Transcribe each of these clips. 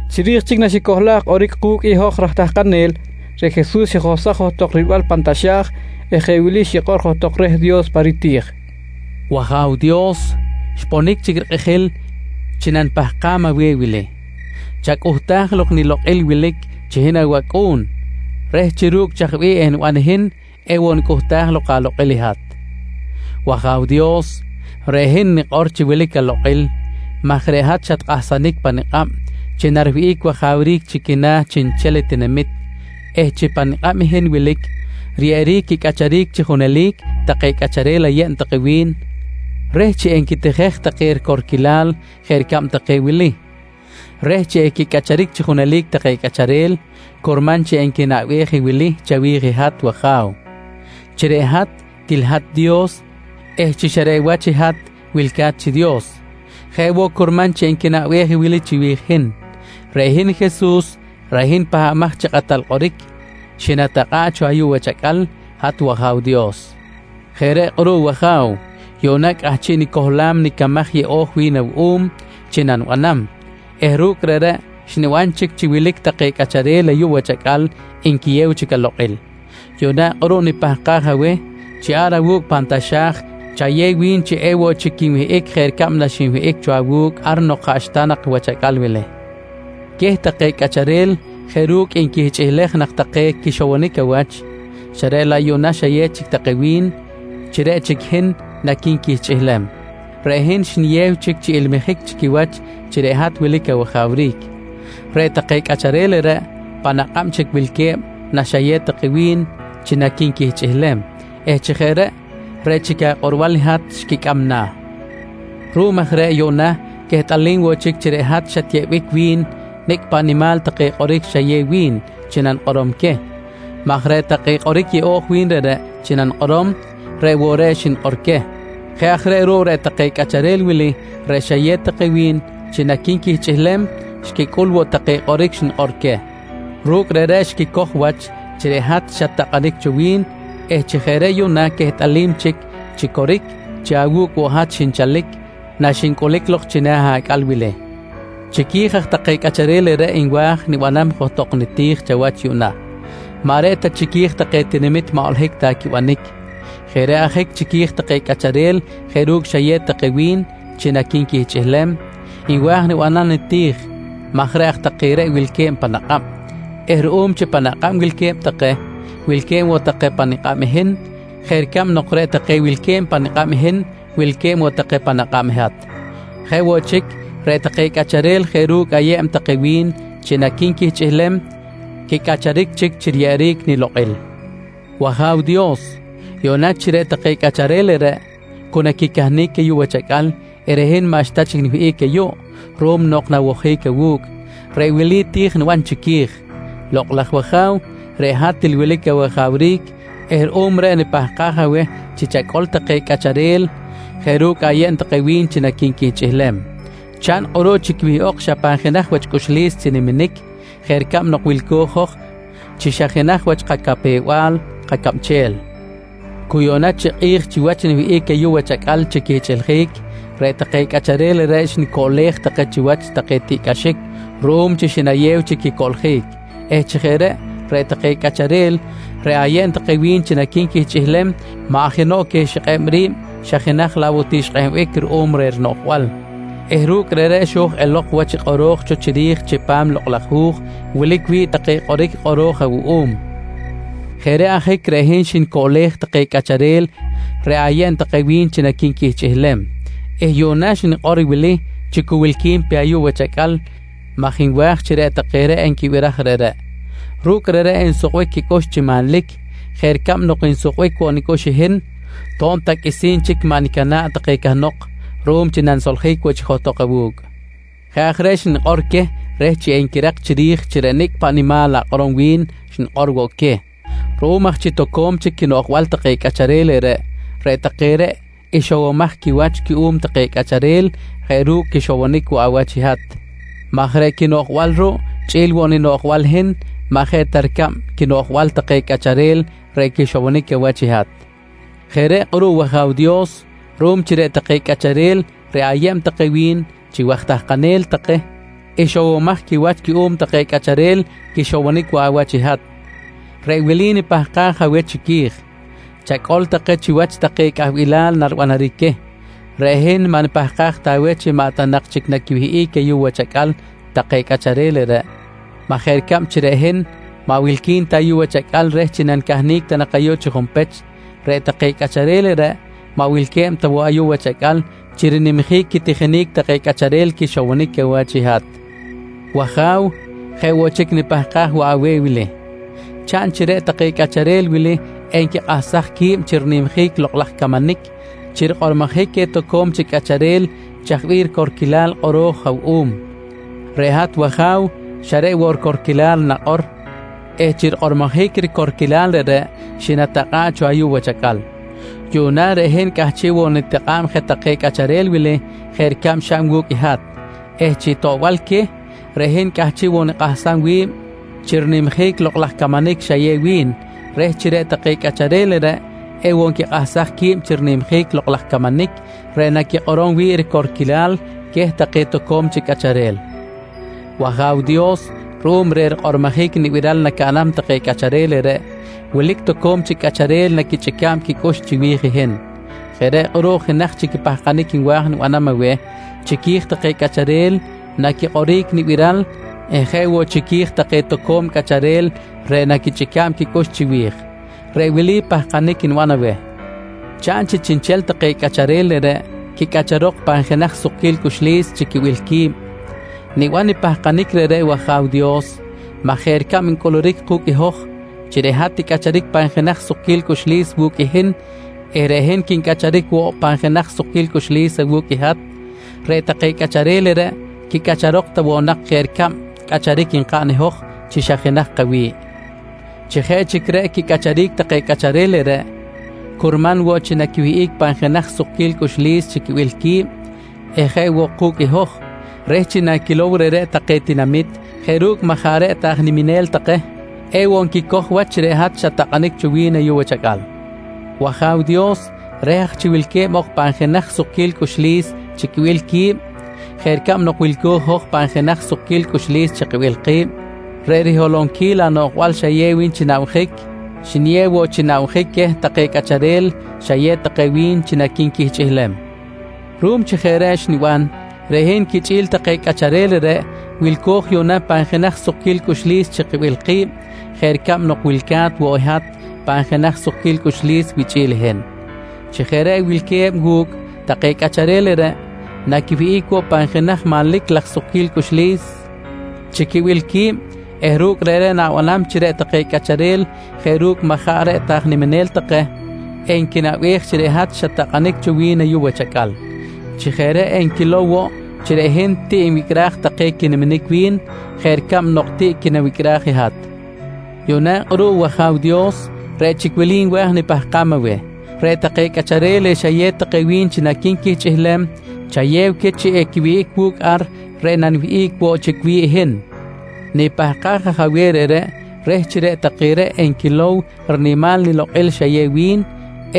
Chiri̱j chic naxicohlaj kꞌoric ku̱cꞌ i hoj raj tahkanel, reꞌ Jesus xijohsaj johtok rilbal pan taxa̱j eh jeꞌ wili xikꞌor johtok reh Dios pa riti̱j: «W-Aja̱w Dios, xponic chic rikꞌijil chi nanipahkam aweh i wili: Chacꞌuhtaj lok i nilokꞌil wilic chi hin awAcꞌu̱n reh chi ru̱cꞌ chaj bih eniban i hin ewoꞌ nicꞌuhtaj lok alokꞌil i hat. W-Aja̱w Dios, reꞌ hin nikꞌor chi wilic alokꞌil maj reꞌ hat xakꞌahsaj pa nikꞌab chi nariwihꞌic wajawric chi quina̱ chiꞌnchel tinamit eh chi pa nikꞌab i hin wilic riyeꞌeric quicꞌacharic chi junelic take cꞌacharel ayeb take wi̱n reh chi enquitijej take ricorquilal jeꞌ ricab take wili: Reh chi equicꞌacharic chi junelic take cꞌacharel, curman chi enquinaꞌbej i wili chawi̱j hat wAja̱w: Chi reꞌ hat, til hat i Dios eh chi xa reꞌ wach i hat wilca̱t chi Dios. Jeꞌ woꞌ curman chi enquinaꞌbej i wili chiwi̱j i hin: Reꞌ hin Jesus reꞌ hin Pahbamaj chi Kꞌatal Kꞌoric, xinatakꞌa̱ꞌ cho ayuꞌ wach acꞌal hat wAja̱w Dios. Jeꞌ reꞌ kꞌuruꞌ wAja̱w, yuꞌna cꞌahchiꞌ nicohlam i nicamaj yeꞌo̱j wi̱n awuꞌum chi nanibanam eh ru̱cꞌ reꞌreꞌ xniban chic chi wilic take cꞌacharel ayuꞌ wach acꞌal nquiyew chic alokꞌil. «Yuꞌna kꞌuruꞌ nipahkaj aweh chi ar awu̱cꞌ pan taxa̱j chayew wi̱n chi ewoꞌ chic quinwihꞌic jeꞌ ricab naxinwihꞌic cho awu̱cꞌ ar nok jaꞌxta nak i wach acꞌal wili. Queh take cꞌacharel jeꞌ ru̱cꞌ nquihchꞌilej nak take quixowonic awach xa reꞌ laꞌ yuꞌna xayew chic take wi̱n chi reꞌ chic i hin naqui̱nquihchꞌilem, reꞌ hin xniyew chic chi ilmijic chi quiwach chi reꞌ hat wilic awajawric. Reꞌ take cꞌacharel reꞌreꞌ pan akꞌab chic wilque̱b naxayew take wi̱n chi naqui̱nquihchꞌilem eh chi jeꞌ reꞌ, reꞌ chic akꞌorbal i hat xquicꞌam na̱. Ruꞌum aj reꞌ yuꞌna quehtꞌalim woꞌ chic chi reꞌ hat xatyeꞌbic wi̱n i nicꞌ paꞌ nimal take kꞌoric xayew wi̱n chi rikꞌormojic queh maj reꞌ take kꞌoric yeꞌo̱j wi̱n reꞌreꞌ chi nanikꞌorom, reꞌ woꞌ reꞌ xnikꞌor queh. Jeꞌ aj reꞌ ruꞌ, reꞌ take cꞌacharel wili reꞌ xayew take wi̱n chi naqui̱nquihchꞌilem, xquicꞌul woꞌ take kꞌoric xnikꞌor queh. Ru̱cꞌ reꞌreꞌ xquicoj wach chi reꞌ hat xat-takꞌanic cho wi̱n eh chi jeꞌ reꞌ yuꞌna quehtꞌalim chic chi coric chi awu̱cꞌ woꞌ i hat xinchalic naxincꞌulic lok china̱ acꞌal wili. «Chiqui̱j aj take cꞌacharel reꞌreꞌ nwa̱j nibanam johtok niti̱j chawach yuꞌna, maꞌ reꞌ ta chiqui̱j take tinamit maꞌ holohic ta quibanic. Jeꞌ reꞌ ajic chiqui̱j take cꞌacharel jeꞌ ru̱cꞌ xayew take wi̱n chi naqui̱nquihchꞌilem, nwa̱j nibanam niti̱j maj reꞌ aj take reꞌ wilque̱b pan akꞌab eh ruꞌum chi pan akꞌab wilque̱b take, wilque̱b woꞌ take pa nikꞌab i hin jeꞌ ricab nok reꞌ take wilque̱b pa nikꞌab i hin, wilque̱b woꞌ take pan akꞌab i hat. Jeꞌ woꞌ chic, reꞌ take cꞌacharel jeꞌ ru̱cꞌ ayeb take wi̱n chi naqui̱nquihchꞌilem, quicꞌacharic chic chi riyeꞌeric nilokꞌil. «W-Aja̱w Dios, yuꞌna chi reꞌ take cꞌacharel reꞌreꞌ cu naquicahnic ayuꞌ wach acꞌal eh reꞌ hin maꞌxta chic niwihꞌic ayuꞌ ruꞌum nok nawojic awu̱cꞌ, reꞌ wili ti̱j niban chiqui̱j: Lokꞌ laj wAja̱w, reꞌ hat til wilic awajawric eh ruꞌum reꞌ nipahkaj aweh chi chacꞌol take cꞌacharel jeꞌ ru̱cꞌ ayeb take wi̱n chi naqui̱nquihchꞌilem. Chaꞌn kꞌuruꞌ chi quiwihꞌok xa pan jenaj wach cꞌuxlis chi niminic jeꞌ ricab nok wilco̱j i hoj chi xa jenaj wach kacapew-bal kacabchel. «Cu yuꞌna chi kꞌi̱j chiwach niwihꞌic ayuꞌ wach acꞌal chi quihchꞌiljic, reꞌ take cꞌacharel reꞌreꞌ xnicoꞌlej take chiwach take tiꞌcꞌaxic ruꞌum chi xinayew chi quicoꞌljic eh chi jeꞌ reꞌ, reꞌ take cꞌacharel reꞌ ayeb take wi̱n chi naqui̱nquihchꞌilem maꞌ jenoꞌ queh xikꞌeb ri̱b xa jenaj laꞌ woꞌ ti xkꞌehbic ruꞌum reh rinoꞌjbal eh ru̱cꞌ reꞌreꞌ xo̱j elok wach i kꞌoro̱j cho chiri̱j chipam i Lokꞌ laj Hu̱j wilic wi̱ꞌ take kꞌoric kꞌoro̱j awuꞌum. Jeꞌ reꞌ ajic reꞌ hin xnicoꞌlej take cꞌacharel reꞌ ayeb take wi̱n chi naqui̱nquihchꞌilem eh yuꞌna xnikꞌor wili chi cu wilqui̱n pe ayuꞌ wach acꞌal maj nwa̱j chi reꞌ take reꞌ enquibiraj reꞌreꞌ. Ru̱cꞌ reꞌreꞌ ensukbic quicꞌux chi manlic jeꞌ ricab nok nsukbic woꞌ nicꞌux i hin to̱b ta qꞌuisi̱n chic maꞌ nicana̱ꞌ take cahnok ruꞌum chi nanisoljic woꞌ chic johtok awu̱cꞌ. Jeꞌ aj reꞌ xnikꞌor queh reh chi enquirak chiri̱j chi reꞌ nicꞌ paꞌ nimal akꞌorom wi̱n xnikꞌor woꞌ queh. Ruꞌum aj chi toco̱m chic quinoꞌjbal take cꞌacharel reꞌreꞌ, reꞌ take reꞌ ixowomaj quiwach cuꞌum take cꞌacharel jeꞌ ru̱cꞌ quixowonic woꞌ awach i hat maj reꞌ quinoꞌjbal ruꞌ chꞌi̱l woꞌ ninoꞌjbal i hin maꞌ jeꞌ ta ricab quinoꞌjbal take cꞌacharel reꞌ quixowonic awach i hat. «Jeꞌ reꞌ kꞌuruꞌ wAja̱w Dios, ruꞌum chi reꞌ take cꞌacharel reꞌ ayeb take wi̱n chi waj tahkanel take ixowomaj quiwach cuꞌum take cꞌacharel quixowonic woꞌ awach i hat, reꞌ wili nipahkaj aweh chiqui̱j: Chacꞌol take chiwach take cꞌahbilal naribanaric queh. Reꞌ hin maꞌ nipahkaj ta aweh chi maꞌ ta nak chic naquiwihꞌic ayuꞌ wach acꞌal take cꞌacharel reꞌreꞌ maj jeꞌ ricab chi reꞌ hin maꞌ wilqui̱n ta ayuꞌ wach acꞌal reh chi nanicahnic ta nak ayuꞌ chi junpech, reꞌ take cꞌacharel reꞌreꞌ maꞌ wilque̱b ta woꞌ ayuꞌ wach acꞌal chi rinimjic quitijinic take cꞌacharel quixowonic awach i hat. «W-Aja̱w, jeꞌ woꞌ chic nipahkaj woꞌ aweh wili: Chaꞌn chi reꞌ take cꞌacharel wili enquikꞌahsaj qui̱b chi rinimjic i lokꞌ laj camanic chi rikꞌormojic queh toco̱m chic cꞌacharel chaj bih ricorquilal i kꞌoro̱j awuꞌum. Reꞌ hat wAja̱w xa reꞌ woꞌ ricorquilal nakꞌor eh chi rikꞌormojic ricorquilal reꞌreꞌ xinatakꞌa̱ꞌ cho ayuꞌ wach acꞌal. Yuꞌna reꞌ hin cꞌahchiꞌ woꞌ nitakꞌa̱b je take cꞌacharel wili jeꞌ ricab xaꞌn wu̱cꞌ i hat eh chi toꞌbal queh, reꞌ hin cꞌahchiꞌ woꞌ nikꞌahsam wi̱b chi rinimjic i lokꞌ laj camanic xayew wi̱n reh chi reꞌ take cꞌacharel reꞌreꞌ ewoꞌ nquikꞌahsaj qui̱b chi rinimjic i lokꞌ laj camanic reꞌ naquikꞌorom wi̱ꞌ ricorquilal queh take toco̱m chic cꞌacharel. «W-Aja̱w Dios ruꞌum reh rikꞌormojic i nibiral nacaꞌnam take cꞌacharel reꞌreꞌ, wilic toco̱m chic cꞌacharel naquichꞌica̱b quicꞌux chiwi̱j i hin. Jeꞌ reꞌ kꞌuruꞌ jenaj chic i pahkanic nwa̱j nibanam aweh chiqui̱j take cꞌacharel naquikꞌoric nibiral eh jeꞌ woꞌ chiqui̱j take toco̱m cꞌacharel reꞌ naquichꞌica̱b quicꞌux chiwi̱j. Reꞌ wili pahkanic niban aweh: Chaꞌn chi chiꞌnchel take cꞌacharel reꞌreꞌ quicꞌacharok pan jenaj sukquil cꞌuxlis chi quibil qui̱b. Niban i pahkanic reꞌreꞌ wAja̱w Dios maj jeꞌ ricab ncꞌuluric ku̱cꞌ i hoj chi reꞌ hat ticꞌacharic pan jenaj sukquil cꞌuxlis wu̱cꞌ i hin eh reꞌ hin quincꞌacharic woꞌ pan jenaj sukquil cꞌuxlis awu̱cꞌ i hat, reꞌ take cꞌacharel reꞌreꞌ quicꞌacharok ta woꞌ nak jeꞌ ricab i cꞌacharic nkaꞌn i hoj chi xa jenaj kawi̱ꞌ. Chi jeꞌ chic reꞌ quicꞌacharic take cꞌacharel reꞌreꞌ, curman woꞌ chi naquiwihꞌic pan jenaj sukquil cꞌuxlis chi quibil qui̱b eh jeꞌ woꞌ ku̱cꞌ i hoj reh chi naquilow reꞌreꞌ take tinamit jeꞌ ru̱cꞌ maꞌ jaꞌ reꞌ ta aj niminel take, ewoꞌ nquicoj wach chi reꞌ hat xat-takꞌanic cho wi̱n ayuꞌ wach acꞌal. «W-Aja̱w Dios, reh aj chi wilque̱b ok pan jenaj sukquil cꞌuxlis chi quibil qui̱b jeꞌ ricab nok wilco̱j i hoj pan jenaj sukquil cꞌuxlis chi kibil ki̱b, reꞌ riholonquil anoꞌjbal xayew wi̱n chi nabjic, xniyew woꞌ chi nabjic queh take cꞌacharel xayew take wi̱n chi naqui̱nquihchꞌilem. Ruꞌum chi jeꞌ reꞌ xniban, reꞌ hin quichꞌi̱l take cꞌacharel reꞌreꞌ wilco̱j yuꞌna pan jenaj sukquil cꞌuxlis chi kibil ki̱b jeꞌ ricab nok wilca̱t woꞌ i hat pan jenaj sukquil cꞌuxlis wichꞌi̱l i hin. Chi jeꞌ reꞌ wilque̱b wu̱cꞌ take cꞌacharel reꞌreꞌ, naquiwihꞌic woꞌ pan jenaj manlic laj sukquil cꞌuxlis chi quibil qui̱b eh ru̱cꞌ reꞌreꞌ na̱banam chi reꞌ take cꞌacharel jeꞌ ru̱cꞌ maꞌ jaꞌ reꞌ ta aj niminel take, enquinaꞌbej chi reꞌ hat xat-takꞌanic cho wi̱n ayuꞌ wach acꞌal. Chi jeꞌ reꞌ enquilow woꞌ chi reꞌ hin tiꞌ nwicꞌraj take quiniminic wi̱n jeꞌ ricab nok tiꞌ quinawicꞌraj i hat. «Yuꞌna kꞌuruꞌ wAja̱w Dios, reꞌ chic wili nwa̱j nipahkam aweh: Reꞌ take cꞌacharel reꞌ xayew take wi̱n chi naqui̱nquihchꞌilem, chayew queh chi equiwihꞌic wu̱cꞌ ar reꞌ naniwihꞌic woꞌ chic wi̱ꞌ i hin. Nipahkaj aj aweh reꞌreꞌ reh chi reꞌ take reꞌ enquilow i rinimal nilokꞌil xayew wi̱n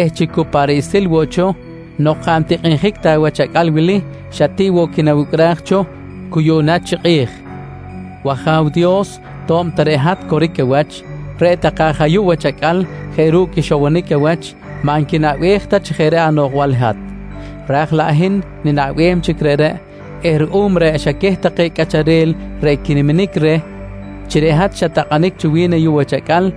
eh chi cu pa riꞌsil woꞌ cho nok jaꞌ ntikꞌinjic ta wach acꞌal wili, xa tiꞌ woꞌ quinawicꞌraj cho cu yuꞌna chi kꞌi̱j. «W-Aja̱w Dios to̱b ta reꞌ hat coric awach, reꞌ take aj ayuꞌ wach acꞌal jeꞌ ru̱cꞌ quixowonic awach maꞌ nquinaꞌbej ta chi jeꞌ reꞌ anoꞌjbal i hat. Ra̱j laꞌ hin ninaꞌbem chic reꞌreꞌ eh ruꞌum reꞌ xa queh take cꞌacharel reꞌ quiniminic reh chi reꞌ hat xat-takꞌanic cho wi̱n ayuꞌ wach acꞌal,